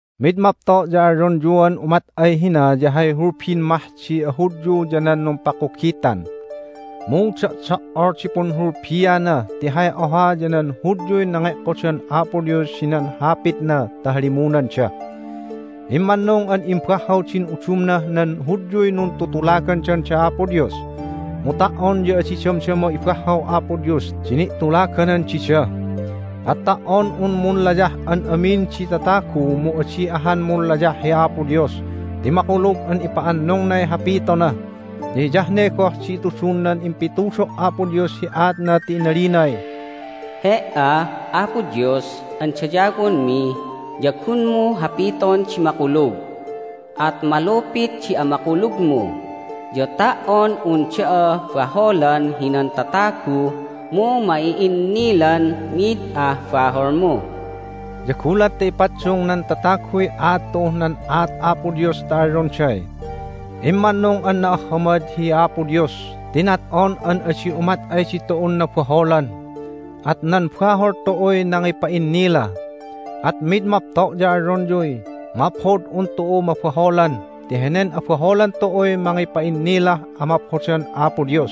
Mid mapto' ya alyonyuan umat ay hina ya hay hulbin mah di aHudyu ya nan numpakugitan. Mu do'do"ol di punhulbiana! Ti hay oha ya nan Hudyuy nange'kodan Apo Dios hinan Hapitna ta halimunanda. Immannung an imbahhaw din udumnah nan Hudyuy nuntutulagandan da Apo Dios, mu ta"on ya adi damdama ibahhaw Apo Dios di ni'tulaganan dida. At ta"on un munlayah an amin di tatagu mu adi ahan munlayah hi Apo Dios ti makulug an ipa'annungnay hapitona! Ya hiyah ne goh di itudun nan impitudo' Apo Dios hi aatna ti inalinay, "He"a, Apo Dios an dayawonmi ya gunmu hapiton di makulug, at malupit di amakulugmu, ya ta"on un da'a baholan hinan tatagu mu ma'i'innilan mid ah baholmu." Ya gulat ta ipaddung nan tataguy aat tu'uh nan aat Apo Dios ta alyonday, "Immannung an na'ahhamad hi Apo Dios ti nat'on an adi umat ay ditu'un nabaholan. At nan bahol tu'uy nangipa'innila!" At mid mapto' ya alyonyuy, "Maphod hi un tu'u mabaholan ti henen abaholan tu'uy mangipa'innilah amaphodan Apo Dios!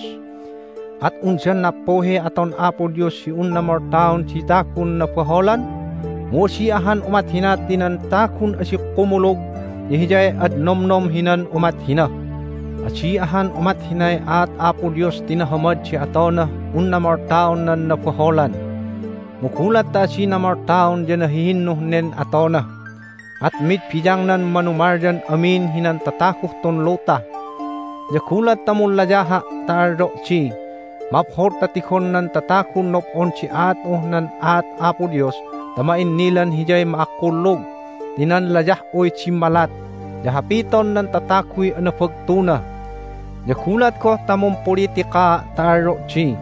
At undan nappuhiy aton Apo Dios hi unna moltaon di tagun nabaholan?" Mu adi ahan umat hina ti nan tagun adi kumulug ya hiyay ad nomnom hinan umat hina. Adi ahan umat hinay aat Apo Dios ti nahamad di atonah unna moltaon nan nabaholan! Mu gulat ta adina moltaon ya nahihinnuh nen atona, at mid biyangnan manumalyan amin hinan tataguh tun luta. Ya gulat ta munlayaha' ta alyo' di, "Maphod ta tigon nan tatagun nob'on di aat'uh nan aat Apo Dios ta ma'innilan Hiyay ma'akkulug ti nan layah'uy dimmalat, ya hapiton nan tataguy anabagtuna!" Ya gulat goh ta mumpulitikaa' ta alyo' di,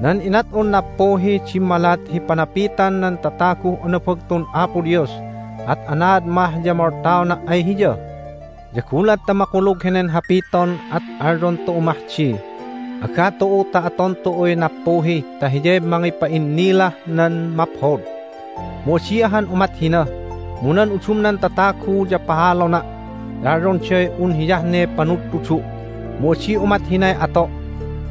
"Nan inat'un nappuhiy dimmalat hi panapitan nan tataguh anabagtun Apo Dios, at anaad mah ya moltaona' ay Hiya?" Ya gulat ta makulug henen hapiton at alyon tu'u mah di, "Aga tu'u ta aton tu'uy nappuhi ta hiyay mangipa'innilah nan maphod!" Mu adi ahan umat hina! Mu nan udumnan tatagu ya pahalona' ti alyonday un hiyah ne panudtudu', mu adi umat hinay ato'.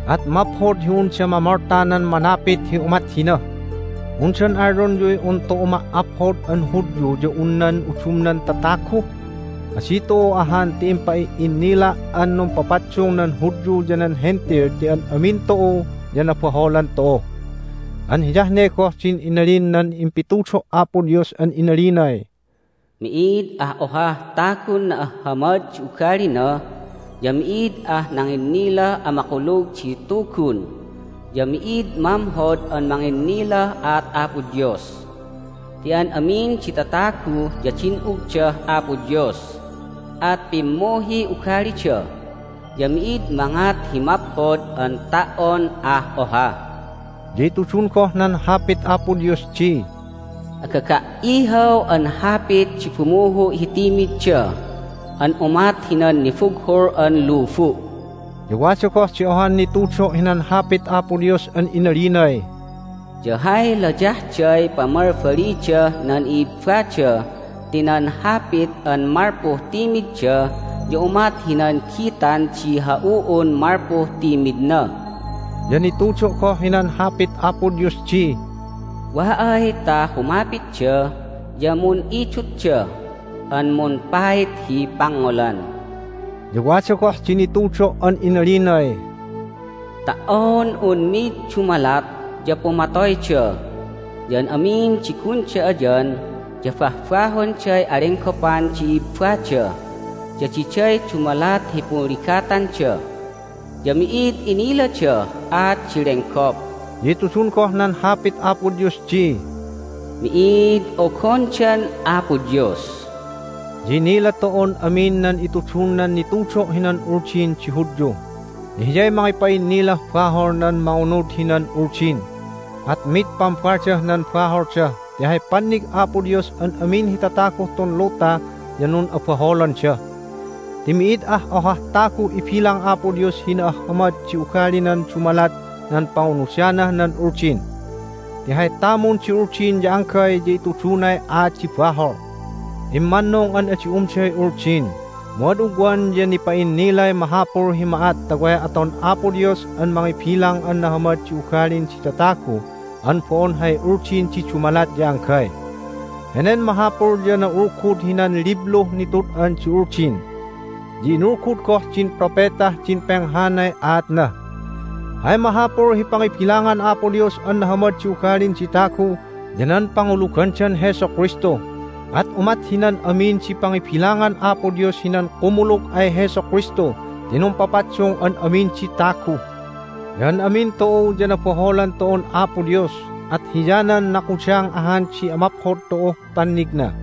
At maphod hi unda mamolta nan manapit hi umat hina. Undan alyonyuy un tu'u ma"aphod an Hudyu ya un nan udumnan tatagu? Adi tu'u ahan, ti impa'i'innila' an numpapaddung nan Hudyu ya nan Hentil ti an amin tu'u ya nabaholan tu'u. An hiyah ne goh din inalin nan impitudo' Apo Dios an inalinay, "Mi'id ah ohah tagun na'ahhamad di ugalina, ya mi'id ah nanginnilah amakulug di Tugun, ya mi'id mamhod an manginnilah aat Apo Dios. Ti an amin di tatagu ya din'ugdah Apo Dios, at pimmuhiy ugalida, ya mi'id mangat hi maphod an ta"on ah oha." Ya itudun goh nan Hapit Apo Dios di, "Agaga"ihaw an hapit di bumuhu' hi timidda an umat hinan nibughul an lubu'." Ya wada goh di ohan nitudo' hinan Hapit Apo Dios an inalinay, "Ya hay layahday pamalbalidah nan i'ibbada ti nan hapit an malpuh timidda ya umat hinan gitan di ha'u'un malpuh timidna." Ya nitudo' goh hinan Hapit Apo Dios di, "Wa ay ta humapitda ya mun'idutda, an mumpait hi pangngolan." Ya wada goh di nitudo' an inalinay, "Ta"on un mid dumalat ya pumatoyda, ya an amin di gunda ayan ya bahbahonday alenggopan di i'ibbada, ya diday dumalat hi punligatanda. Ya mi'id iniladah aat di lenggop." Ya itudun goh nan Hapit Apo Dios di, "Mi'id ogondan Apo Dios." Ya inila tu'un amin nan itudun nan nitudo' hinan Uldin di Hudyu, ya hiyay mangipa'innilah bahol nan mangunud hinan Uldin. At mid pambaldah nan baholda ti hay pannig Apo Dios an amin hi tataguh tun luta ya nun'abaholanda. Ti mi'id ah ohah taguh ibilang Apo Dios hi na'ahhamad di ugalinan dumalat nan pangunudanah nan Uldin. Ti hay tamun di Uldin ya anggay ya itudunay aat di bahol. Immannung an adi umday Uldin. Mu ad ugwan ya nipa'innilay mahapul hi ma'at ta way aton Apo Dios an mangibilang an nahamad di ugalin di tatagu an bo'on hay Uldin di dumalat ya anggay. Henen mahapul ya na'ulgud hinan libluh nitud'an di Uldin, ya inulgud goh din propetah din penghanay aatna. Hay mahapul hi pangibilangan Apo Dios an nahamad di ugalin di tagu ya nan pangulugandan Jesu Kristu. At umat hinan amin di pangibilangan Apo Dios hinan kumulug ay Jesu Kristu ti numpapaddung an amin di tagu. Ya an amin tu'u ya nabaholan tu'un Apo Dios, at hiyanan nakudang ahan di amaphod tu'uh pannigna.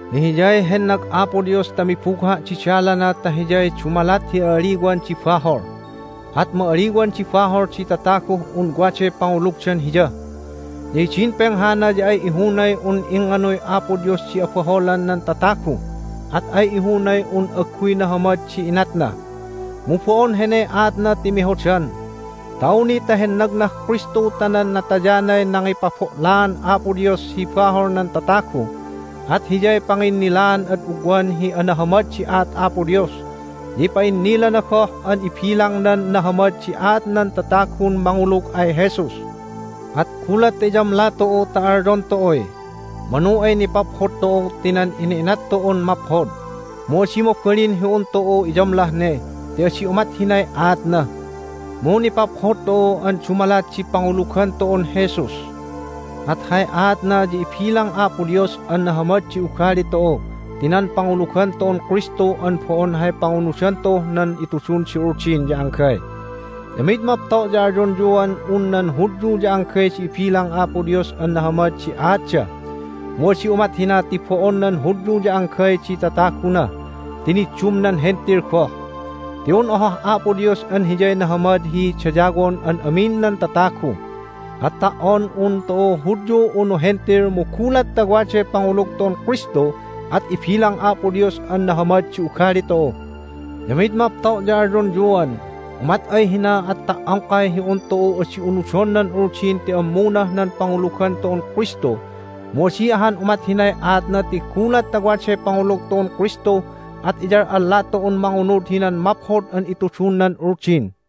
Ti Hiyay hennag Apo Dios ta mibugha' di dalana ta Hiyay dumalat hi a'aliwan di bahol, at ma'aliwan di bahol di tataguh un waday pangulugdan Hiya. Ya hidin penghana ya ay ihunay un ingnganuy Apo Dios di abaholan nan tatagu, at ay ihunay un agguy nahamad di inatna. Mu bo'on heney aatna ti mehodan, ta awni ta hennagnah Kristu ta nan natayanay nangipabo'laan Apo Dios hi bahol nan tatagu, at Hiyay panginnilaan ad ugwan hi anahamad di aat Apo Dios. Ya ipa'innilana goh an ibilangnan nahamad di aat nan tatagun mangulug ay Jesus. At gulat ta iyamla tu'u ta alyon tu'uy, "Manu ay nipaphod tu'u ti nan ina'inat tu'un maphod!" Mu adi mabalin hi un tu'u iyamlah ne ti adi umat hinay aatna. Mu nipaphod tu'u an dumalat di pangulugan tu'un Jesus. At hay aatna ya ibilang Apo Dios an nahamad di ugali tu'u ti nan pangulugan tu'un Kristu an bo'on hay pangunudan tu'uh nan itudun di Uldin ya anggay. Ya mid mapto' ya alyonyuan un nan Hudyu ya anggay di ibilang Apo Dios an nahamad di aatda. Mu adi umat hina ti bo'on nan Hudyu ya anggay di tataguna ti niddum nan Hentil goh. Ti un ohah Apo Dios an Hiyay nahamad hi dayawon an amin nan tatagu, at ta"on un tu'u Hudyu unu Hentil mu gulat ta waday pangulug tu'un Kristu at ibilang Apo Dios an nahamad di ugali tu'u. Ya mid mapto' ya alyonyuan, "Umat ay hina at ta"ongkay hi un tu'u adi unudon nan Uldin ti ammunah nan pangulugan tu'un Kristu!" Mu adi ahan umat hinay aatna ti gulat ta waday pangulug tu'un Kristu at iyal'alla tu'un mangunud hinan maphod an itudun nan Uldin.